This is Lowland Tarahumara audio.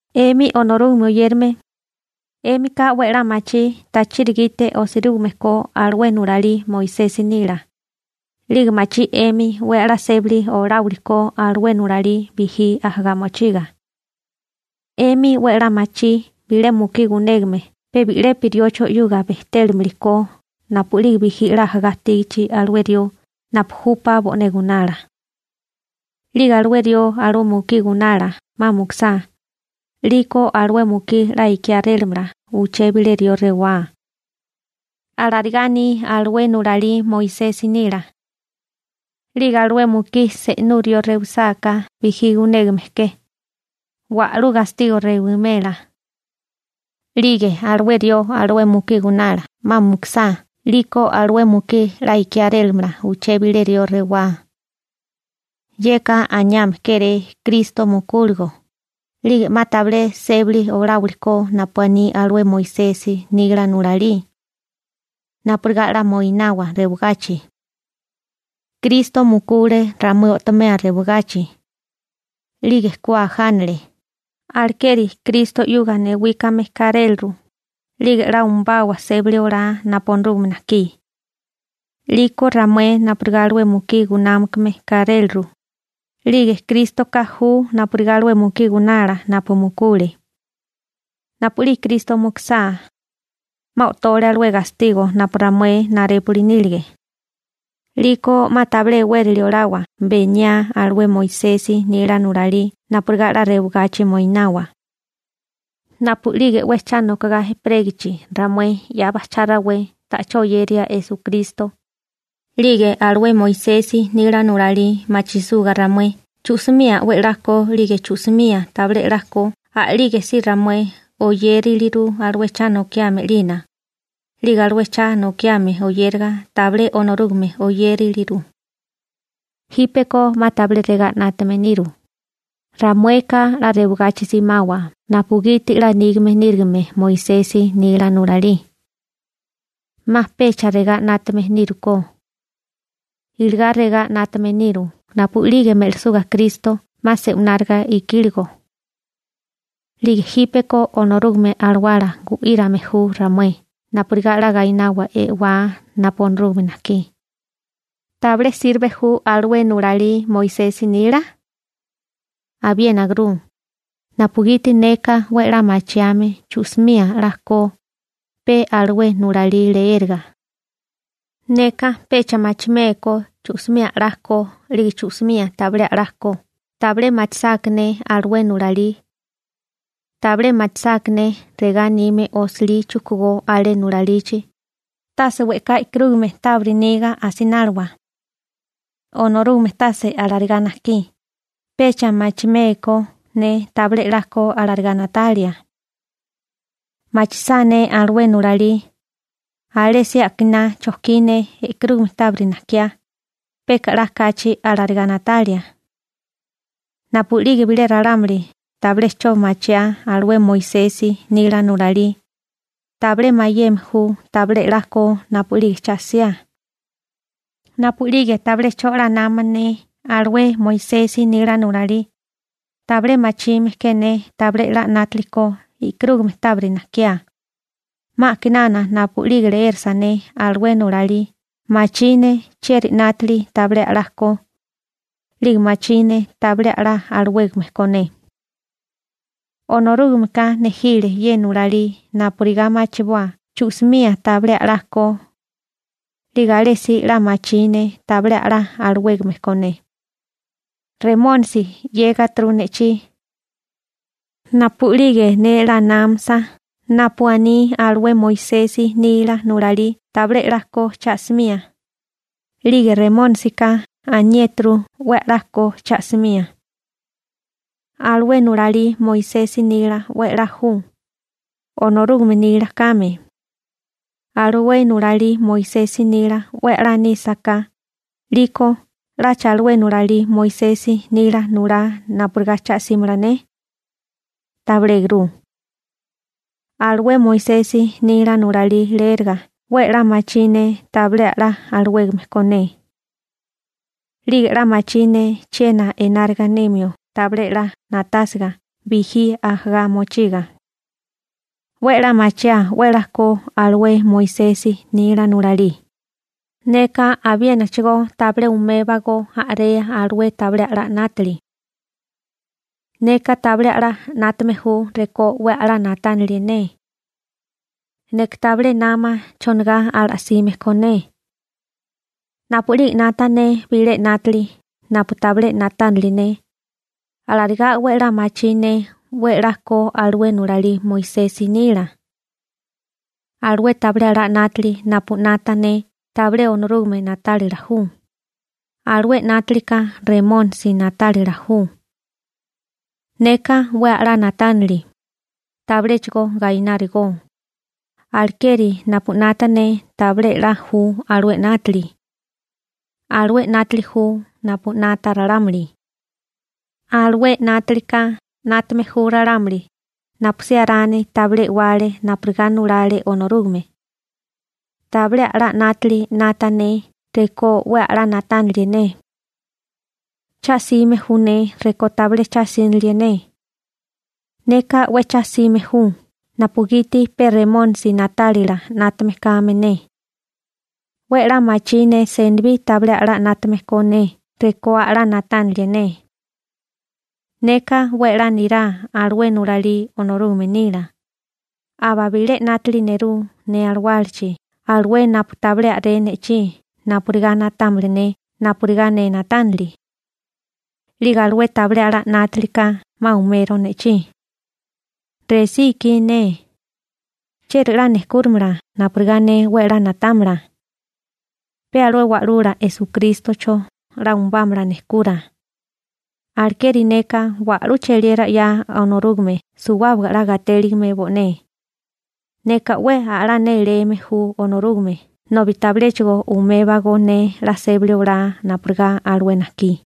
'Emi Onorúgame oyérame, 'émika 'we 'la machí tachiri gite osirúgime ko alué nulalí Moisesi nila, 'lige machí 'emi 'we 'la sébali oláwili ko alué nulalí bijí ajagá mochiga. 'Emi 'we 'la machí bilé mukí gunégame pe bi'lepi riocho 'yuga bejtélimili ko napu'lige bijí 'la ajagá ajtígachi alué rió napu júpá bo'né gunala. 'Lige alué rió alué mukí gunala 'ma mukusá, 'liko alué mukí 'la ikiárélamala uché bilé rió rewá. Alarigá aní alué nulalí Moisesi nila. 'Lige alué mukí se'nú rió rewisáká bijí gunégame ke, wa'lú gastigo rewimela. 'Lige alué rió alué mukí gunala 'ma mukusá 'liko alué mukí 'la ikiárélamala uché bilé rió rewá. Yeka aniame kéré Kristo mukúligo, 'lige 'ma tabilé sébali oláwili ko napu aní alué Moisesi nila nulalí napurigá 'la moinawa rewagachi. Kristo mukule ramué o'tomea rewagachi. 'Lige ku ajánale, alekeri Kristo 'yuga newíkame káréliru, 'lige 'la umbawa sébali olá napu Onorúgame najkí. 'Liko ramué napurigá alué mukí gunámakame káréliru, 'lige Krístoka ju napurigá alué mukí gunala napu mukule. Napu'lige Kristo mukusá 'ma o'tole alué gastigo napu ramué narépuli nílige. 'Liko 'ma tabilé e'wérali olawa beniá alué Moisesi nila nulalí napurigá 'la rewagachi moinawa. Napu'lige 'we cha nokogá ejperégichi ramué 'ya bajchá rawé ta'chó oyeria Esukristo, 'lige alué Moisesi nila nulalí machisuga ramué chu'simía 'we 'la ko 'lige chu'simía tabilé 'la ko a'lígesí ramué oyériliru alué cha nokiame 'lina, 'lige alué cha nokiame oyéraga tabilé Onorúgame oyériliru. Jípeko 'ma tabilé regá 'nátame niru: «Ramueka 'la rewagachi simawa napugiti 'la nígame nírigime Moisesi nila nulalí.» 'Ma pecha regá 'nátame nírukó. Iligá regá 'nátame niru napu'lige me'lisuga Kristo 'ma se'wináriga ikíligo. 'Lige jípeko Onorúgame Alawala gu'írame ju ramué napurigá 'la gainawa e'wá napu Onorúgame najkí. ¿Tabilé sirbe ju alué nulalí Moisesi nila? Abiénaguru, napugiti neka 'we 'la machiame chu'simía 'la ko, pe alué nulalí leéraga. Neka pecha machimékó chu'simía a'lá ko 'lige chu'simía tabilé 'la ko tabilé machisáká ne alué nulalí. Tabilé machisáká ne regá anime osilí chujkugó alé nulalichi: «Tase we'ká e'karúgamea tábiri niga asináliwa. Onorúgame tase alarigá najkí», pecha machimé ko ne tabilé 'la ko alarigá na'tálila. Machisá ne alué nulalí, alésí akiná chojkí ne e'karúgame tábiri najkiá, peka 'la kachi alarigá na'talia. Napu'lige bilé ralámuli tabilé 'cho machiá alué Moisesi nila nulalí, tabilé mayeme ju tabilé 'la ko napu'lige cha 'siá. Napu'lige tabilé 'cho 'la nama ne alué Moisesi nila nulalí, tabilé machime ke ne tabilé 'la 'nátili ko e'karúgame tábiri najkiá, 'ma a'kinana napu'lige leérasa ne alué nulalí, machí ne chieri 'nátili tabilé a'lala ko, 'lige machí ne tabilé a'lá alawégame ko ne. Onorúgameka nejile ye nulalí napurigá machiboa chu'simía tabilé a'lá ko, 'lige alésí 'la machí ne tabilé a'lá alawégame ko ne. Remónisi 'yégaturu ne'chí. Napu'lige ne 'la námasa napu aní alué Moisesi nila nulalí tabilé 'la ko cha'simía, 'lige Remónisika aniéturu 'we a'lá ko cha'simía. Alué nulalí Moisesi nila 'we a'lá ju, Onorúgame nila kame. Alué nulalí Moisesi nila 'we a'lá nísaká, 'liko ¿'lacha alué nulalí Moisesi nila nulá napurigá cha'símala ne? Tabilégurú. Alué Moisesi nila nulalí leéraga 'we 'la machí ne tabilé a'lá alawégame ko ne. 'Lige 'la machí ne chiena enárigá nimio tabilé 'la na'tásiga bijí ajagá mochiga. 'We 'la machiaa 'we 'la ko alué Moisesi nila nulalí, neka abiénachigo tabilé umébagó a'rea alué tabilé a'lá 'nátili. Neka tabilé a'lá 'nátame ju rekó 'we a'lá na'tánilie ne. Neka tabilé nama chonigá ala'sime ko ne. Napu'lige 'nata ne bilé 'nátili napu tabilé na'tánili ne, alarigá 'we 'la machí ne 'we 'la ko alué nulalí Moisesi nila. Alué tabilé a'lá 'nátili napu 'nata ne tabilé Onorúgame na'tálila ju, alué 'nátilika Remónisi na'tálila ju. Neka 'we a'lá na'tánili, tabiléchigo gainárigó, alekeri napu 'nata ne tabilé 'la ju alué 'nátili. Alué 'nátili ju napu 'nata ralámuli, alué 'nátilika 'nátame ju ralámuli napusí Arani tabilé e'wale napurigá nulale Onorúgame. Tabilé a'lá 'nátili 'nata ne rekó 'we a'lá na'tánalie ne. Cha'sime ju ne rekó tabilé cha'sínilie ne. Neka 'we cha'sime ju napugiti pe Remónisi na'tálila 'nátame kame ne. 'We 'la machí ne senibí tabilé a'lá 'nátame ko ne rekó a'lá na'tánalie ne. Neka 'we 'la nirá alué nulalí Onorúgame nila, aba bilé 'nátili nerú ne alawálachi alué napu tabilé a'ré ne'chí napurigá na'támala ne napurigá ne na'tánili. 'Lige alué tabilé a'lá 'nátilika 'ma umero ne'chí. ¡Resí ikí ne! ¿Chieri 'la nejkúrimala napurigá ne 'we a'lá na'támala? Pe alué Wa'lula Esukrístocho 'la umubámala nejkura. Alekeri neka wa'lú cheliera 'ya Onorúgame suwábaga 'la gatéligime bo'né. Neka 'we a'lá néléme ju Onorúgame nobi tabiléchigo umébago ne 'la sébali olá napurigá alué najkí.